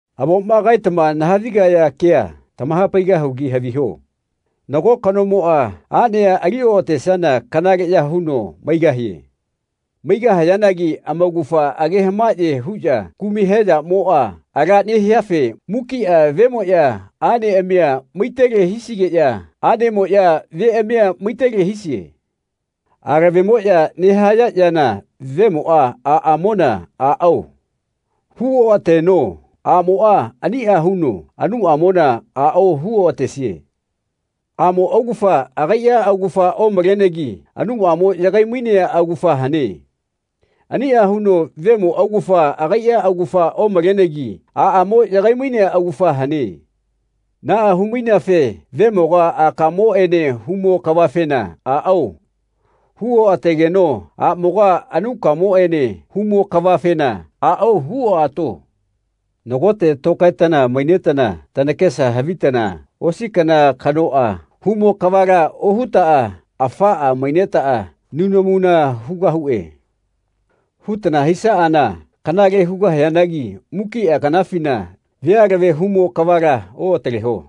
Avoma kaetama nahavigaya kea tamahapaigahugi haviho. Nago kanomoꞌa aꞌnea ali oꞌatesiana kanaleꞌya huno maigahie. Maigahianagi amaugafa age hamaꞌye huꞌya kumai he yamoꞌa ala nehiafe mukiꞌa vemoꞌya aꞌneꞌamia maitele hisigeꞌya aꞌnemoꞌya veꞌamia maitele hisie. Alavemoꞌya nehaya yana vemoꞌa aꞌamona “Aꞌao.” hu oꞌateno aꞌmoꞌa aniꞌa huno anauꞌamona “Aꞌao.” hu oꞌatesie. Aꞌmo augafa agaiꞌa augafa omalenegi anauꞌamo yagai-mainea augafa hane. Aniꞌa huno vemo augafa agaiꞌa augafa omalenegi aꞌamo yagai-mainea augafa hane. Naꞌa humaineafe vemoga akamoꞌene humo kavafena “Aꞌao.” hu oꞌategeno aꞌmoga anaukamoꞌene humo kavafena “Aꞌao.” hu oꞌato. Nagote tokaetana mainetana tanakesa havitana “Osi kana kanoꞌa humo kavala ohutaꞌa afaꞌa mainetaꞌa nunamuna hugahuꞌe.” hutana hisaꞌana kanale hugahianagi mukiꞌa kanafina ve alave humo kavala oꞌataleho.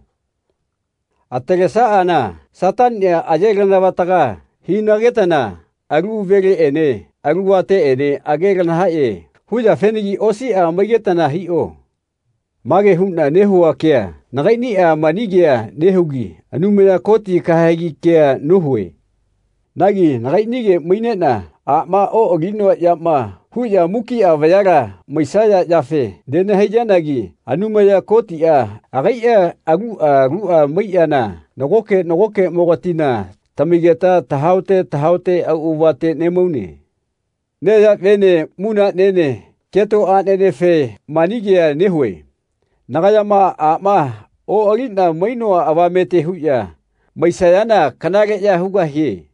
Atalesaꞌana Sataniꞌa ayelana-vataga hinagetana alu veleꞌene alu ateꞌene age lanahaꞌye hu yafenagi osiꞌa maigetana hiꞌo. Mage huꞌna nehua kea nagaiꞌniꞌa mani kea nehugi Anumaya Koti kahegi kea nohue. Nagi nagaiꞌnige maineꞌna aꞌma oꞌalinoa yama huꞌya mukiꞌa vayala maisaya yafe nenahaiyanagi Anumaya Kotiꞌa agaiꞌa aluꞌa luꞌa mai yana nagoke nagokeꞌmogatina tamigeta tahaote tahaote auꞌavate nemaune. Neyaꞌvene munaꞌnene keto aꞌnenefe mani kea nehue nagayama aꞌma oꞌaliꞌna mainoa avamete huꞌya maisayana kanaleꞌya hugahie.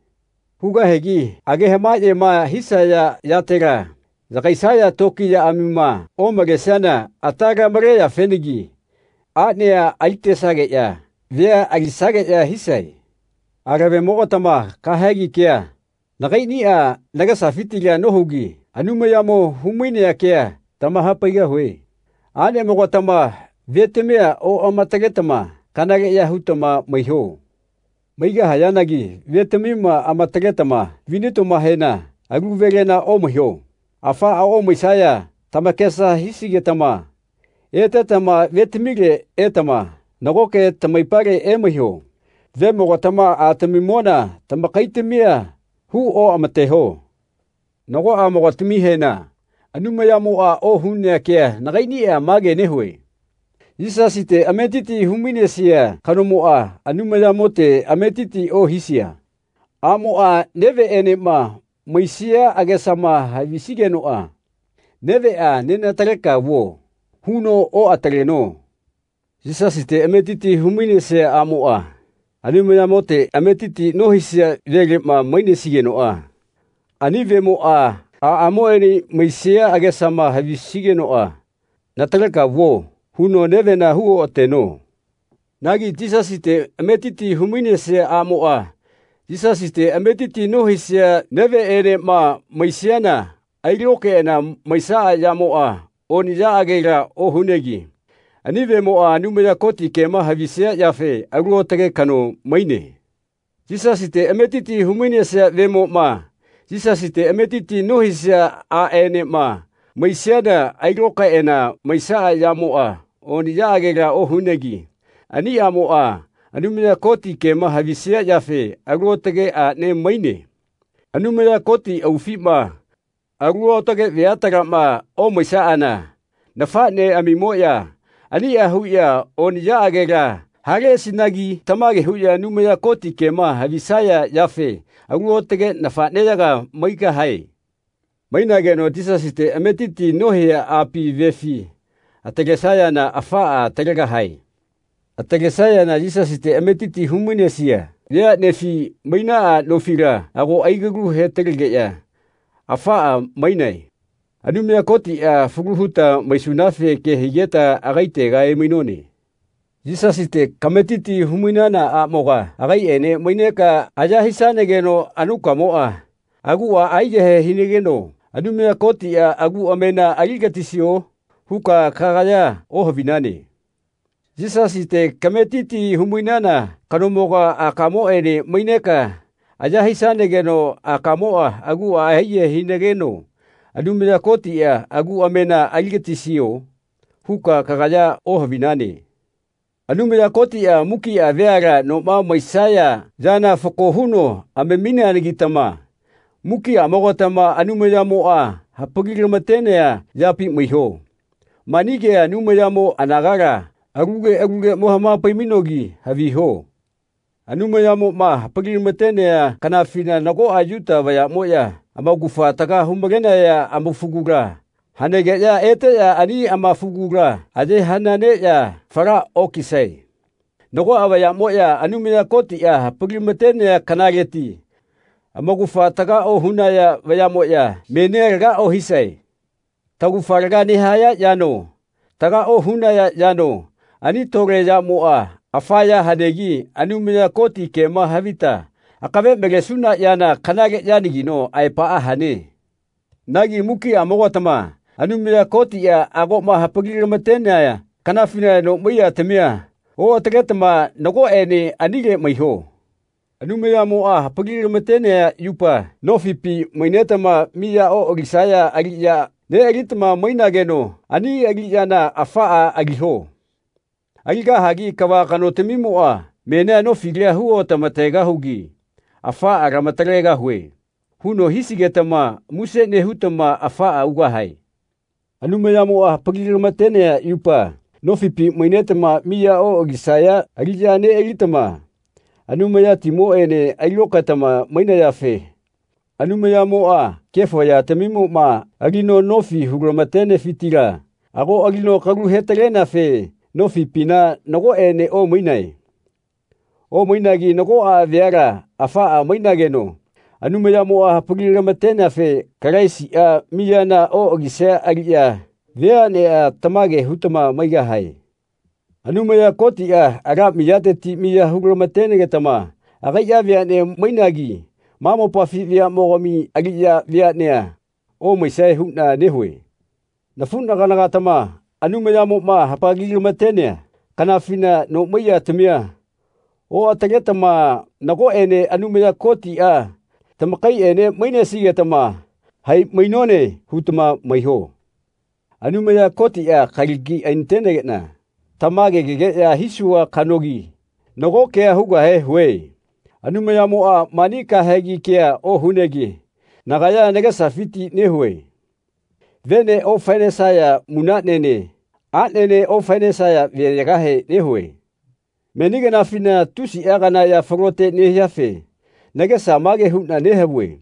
Hugahigi age hamaꞌyema hisaya yatela yagaisaya tokiyaꞌamima omalesiana ata lamale-yafenagi aꞌnea alitesageꞌya vea alisageꞌya hisae. Alavemogatama kahegi kea, nagaiꞌnia nagesafitila nohugi Anumayamo humainea kea tamahapaigahue. Aꞌnemogatama vetamia oꞌamataletama kanaleꞌya hutama maiho. Maigahayanagi vetamima amataletama vinutamahena alu velela omaiho. Afaꞌa omaisaya tamakesa hisigetama etetama vetamile etama nagoke tamaipale emaiho. Vemogatama atamimona tamakaitamia hu oꞌamateho. Nagoꞌamogatamihena Anumayamoꞌa ohunea kea nagaiꞌniꞌa mage nehue. Yisasite ametiti humainesia kanomoꞌa Anumayamote ametiti nohisia aꞌmoꞌa neveꞌenema maisia agesama havisigenoꞌa neveꞌa “Nenataleka vuo.” huno oꞌataleno. Yisasite ametiti hu-mainesia aꞌmoꞌa Anumayamote ametiti nohisia veleꞌma mainesigeno ani vemoꞌa aꞌamoꞌene maisia agesama havisigenoꞌa “Nenataleka vuo.” huno nevena hu oꞌateno. Nagi Yisasite ametiti hu-mainesia aꞌmoꞌa Yisasite ametiti nohisia neveꞌenema maisiana ailokaeꞌana maisaꞌa yamoꞌa oniꞌyaꞌagela ohunegi ani vemoꞌa Anumaya Koti kema havisia yafe alu aotage kano maine. Yisasite ametiti hu-mainesia vemoꞌma Yisasite ametiti nohisia aꞌenema maisiana ailokaeꞌana maisaꞌa yamoꞌa oniꞌyaꞌagela ohunegi ani aꞌmoꞌa Anumaya Koti kema havisia yafe alu aotage aꞌne maine. Anumaya Koti aufima alu aotage veatalama omaisaꞌana nafaꞌneꞌamimoꞌya aniꞌa huꞌya oniꞌyaꞌagela haleꞌasinagi tamage huꞌya Anumaya Koti kema havisaya yafe alu aotage nafaꞌneyaga maigahae. Mainageno Yisasite ametiti nohia api vefi atalesayana afaꞌa atalegahae. Atalesayana Yisasite ametiti hunesia veaꞌnefi mainaꞌa nofila ago aigalu hetalegeꞌya afaꞌa mainae. Anumaya Kotiꞌa falu huta maisunafe ke higeta agaitega emainone. Yisasite kametiti hu-mainana aꞌmoga agaiꞌene maineka aya hisanageno anaukamoꞌa aguꞌa aiyahae hinageno Anumaya Kotiꞌa agu amena aligatisio? huka kagaya ohavinane. Yisasite kametiti hu-mainana kanomoga akamoꞌene maineka aya hisanageno akamoꞌa aguꞌa aiyahae hinageno Anumaya Kotiꞌa agu amena aligatisio? huka kagaya ohavinane. Anumaya Kotiꞌa mukiꞌa veala noma maisaya yana fako huno amamineanagitama mukiꞌamogatama Anumayamoꞌa hapali-lamatenea yapi maiho. Mani kea Anumayamo anagala alule alule mo hamapai-mainogi haviho. Anumayamoꞌma hapalimatenea kanafina nagoꞌa Yuta vayaꞌmoꞌya amaugafa taga hu-malenaya amafugula hanegeꞌya eteꞌya ani amafugula aye hananeꞌya fala okisae. Nagoꞌa vayamoꞌya Anumaya Kotiꞌa hapali-matenea kanaleti amaugafa taga ohunaya vayaꞌmoꞌya menia laga ohisae. Taugafa laga nehaya yano taga ohunaya yano ani tole yamoꞌa afa ya hanegi Anumaya Koti kema havita akave malesuna yana kanale yanagino aepaꞌa hane. Nagi mukiꞌamogatama Anumaya Kotiꞌa agoꞌma hapali-lamatenea kanafina no maiyatamia oꞌataletama nagoꞌene anile maiho. Anumayamoꞌa hapali-lamatenea yupa nofipi mainetama miya oꞌalisaya aliꞌya neꞌalitama mainageno ani aliꞌyana afaꞌa aliho. Aligahagi kava kanotamimoꞌa “Menia nofila huotamategahugi afaꞌa lamatalegahue.” huno hisigetama muse nehutama afaꞌa ugahae. Anumayamoꞌa hapali-lamatenea yupa nofipi mainetama miya oꞌalisaya aliꞌya neꞌalitama Anumayatimoꞌene ailokaetama mainayafe Anumayamoꞌa kefo yatamimoꞌma alino nofi hulamatenefitila ago alino kalu he-taleneafe nofipina nagoꞌene omainae. Omainagi nagoꞌa veala afaꞌa mainageno Anumayamoꞌa hapali-lamateneafe Kalaisiꞌa miyana oꞌalisia aliꞌya veaꞌneꞌa tamage hutama maigahae. Anumaya Kotiꞌa ala miyateti miya hu-lamategetama agai veaꞌne mainagi ma mopafi veaꞌmogami aliꞌya veaꞌnea omaisae huꞌna nehue. Nafuꞌnagana-gatama Anumayamoꞌma hapali-lamatenea kanafina no maiyatamia oꞌataletama nagoꞌene Anumaya Kotiꞌa tamakaiꞌene mainesigetama “Hai mainone.” hutama maiho. Anumaya Kotiꞌa kalagi ainategeꞌna tamagegeꞌya hisua kanogiꞌna nago kea hugahe hue. Anumayamoꞌa mani kahegi kea ohunegi nagaya nagesafiti nehue. Vene ofaenesaya munaꞌnene aꞌnene ofaenesaya veyagahe nehue. Meni kanafina tusiꞌa kana yana falote nehiafe nagesa mage huꞌna nehavue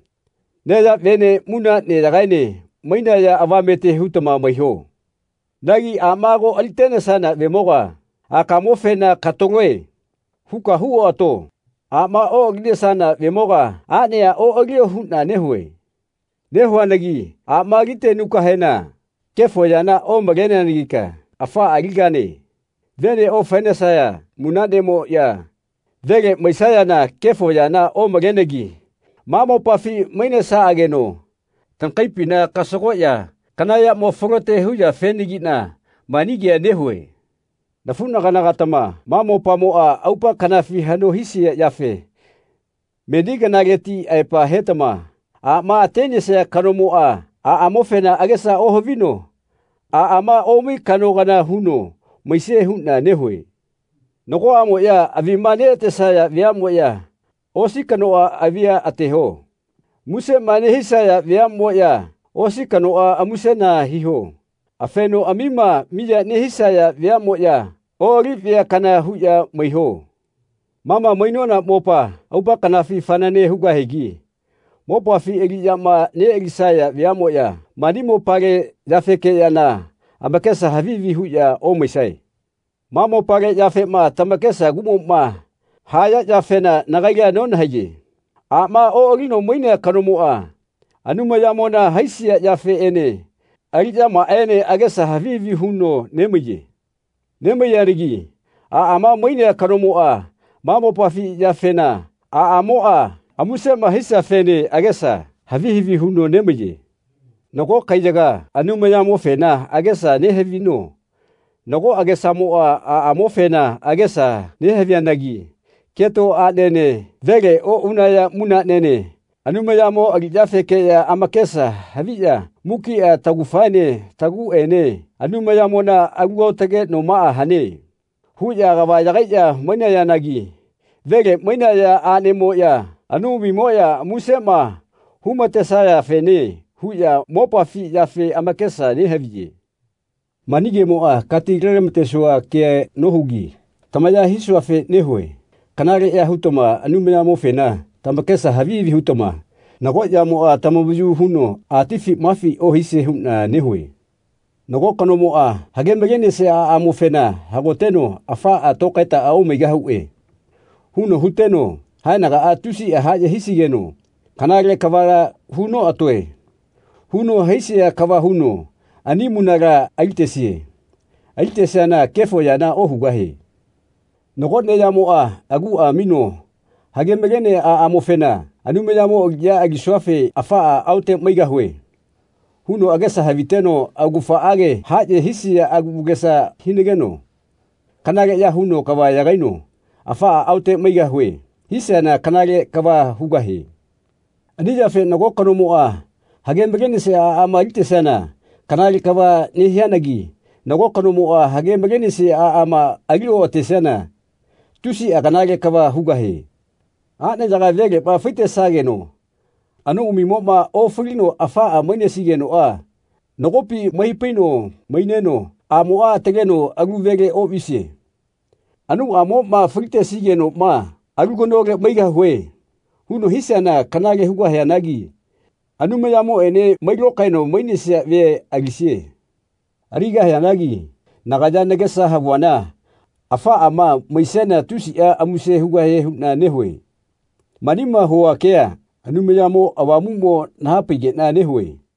neyaꞌvene munaꞌneyagaene mainaya avamete hutama maiho. Nagi aꞌma ago alitenesana vemoga akamofena “Kataloe.” huka hu oꞌato. Aꞌma oꞌalinesana vemoga aꞌnea oꞌalio huꞌna nehue. Nehuanagi aꞌma ali-tenukahena kefo yana omaleneanagika afaꞌa aligane. Vene ofaenesaya munaꞌnemoꞌya vele maisayana kefo yana omalenegi ma mopafi mainesaꞌageno tanakaipina kasagoꞌya kana yamo falote huyafenagiꞌna mani kea nehue. Nafuꞌnagana-gatama ma mopamoꞌa aupa kanafi haꞌno hisia yafe meni kanaleti aepa hetama aꞌma atenesia kanomoꞌa aꞌamofena agesa ohavino aꞌama omai kano kana huno maisie huꞌna nehue. Nagoꞌamoꞌya avima neꞌatesaya veaꞌmoꞌya osi kanoꞌa avia ateho. Musema nehisaya veaꞌmoꞌya osi kanoꞌa musena hiho. Afenoꞌamima miya nehisaya veaꞌmoꞌya oꞌali vea kana huꞌya maiho. Mama mainona mopa aupa kanafi fanane hugahigi mopafi aliꞌyama neꞌalisaya veaꞌmoꞌya mani mopale yafekeꞌyana amakesa havi havi huꞌya omaisae. Ma mopale yafema tamakesa kuꞌmoꞌma haya yafena nagaila nonahaiye. Aꞌma oꞌalino mainea kanomoꞌa Anumayamona haisia yafeꞌene aliꞌyamaꞌaene agesa havi havi huno nemaiye. Nemaiyanagi aꞌama mainea kanomoꞌa ma mopafi yafena, aꞌamoꞌa musema hisiafene agesa havi havi huno nemaiye. Nago kaiyaga Anumayamofena agesa nehavino nago agesamoꞌa aꞌamofena agesa nehavianagi keto aꞌnene vele oꞌunaya munaꞌnene Anumayamo aliꞌyafekeꞌya amakesa haviꞌya “Mukiꞌa taugafaene taguꞌaene Anumayamona alu aotage nomaꞌa hane.” huꞌya kava yagaiꞌya mainayanagi vele mainaya aꞌnemoꞌya anauꞌamimoꞌya musema humatesayafene huꞌya mopafi yafe amakesa nehaviye. Mani kemoꞌa katilelamatesua kea nohugi tamaya hisuafe nehue. Kanaleꞌya hutama Anumayamofena tamakesa havi havi hutama nago yamo tamavayu huno atifi mafi ohisie huꞌna nehue. Nago kanomoꞌa hage-malenesia aꞌamofena hagoteno “Afaꞌa tokaetaꞌa omaigahuꞌe.” huno huteno haenagaꞌa tusi haꞌye hisigeno “Kanale kavala hu noꞌatoe.” huno haisia kava huno ani munala alitesie. Alitesiana kefo yana ohugahie. Nago neyamoꞌa aguꞌa amino hage-malenea aꞌamofena “Anumayamo aliꞌya alisuꞌafe afaꞌa aote maigahuꞌe.” huno agesa haviteno augafa age haꞌye hisia agu agesa hinageno kanaleꞌya huno kava yagaino “Afaꞌa aote maigahuꞌe.” hisiana kanale kava hugahie. Ani yafe nago kanomoꞌa hage-malenesia aꞌama alitesiana kanale kava nehianagi nago kanomoꞌa hage-malenesia aꞌama ali oꞌatesiana tusiꞌa kanale kava hugahie. Aꞌneyaga veleꞌma faitesageno anauꞌamoꞌma ofalino afaꞌa mainesigenoꞌa nagopi mai hapaino maineno aꞌmoꞌa ataleno alu vele oꞌvisie. Anauꞌamoꞌma falitesigenoꞌma “Alu kanole maigahue.” huno hisiana kanale hugahianagi Anumayamoꞌene mai-lokaeno mainesia vea alisie. Aligahianagi nagaya nagesa havuana afaꞌama maisiana tusiꞌa muse hugahie huꞌna nehue. Manima hua kea Anumayamo Avamuꞌmo nahapaigeꞌna nehue.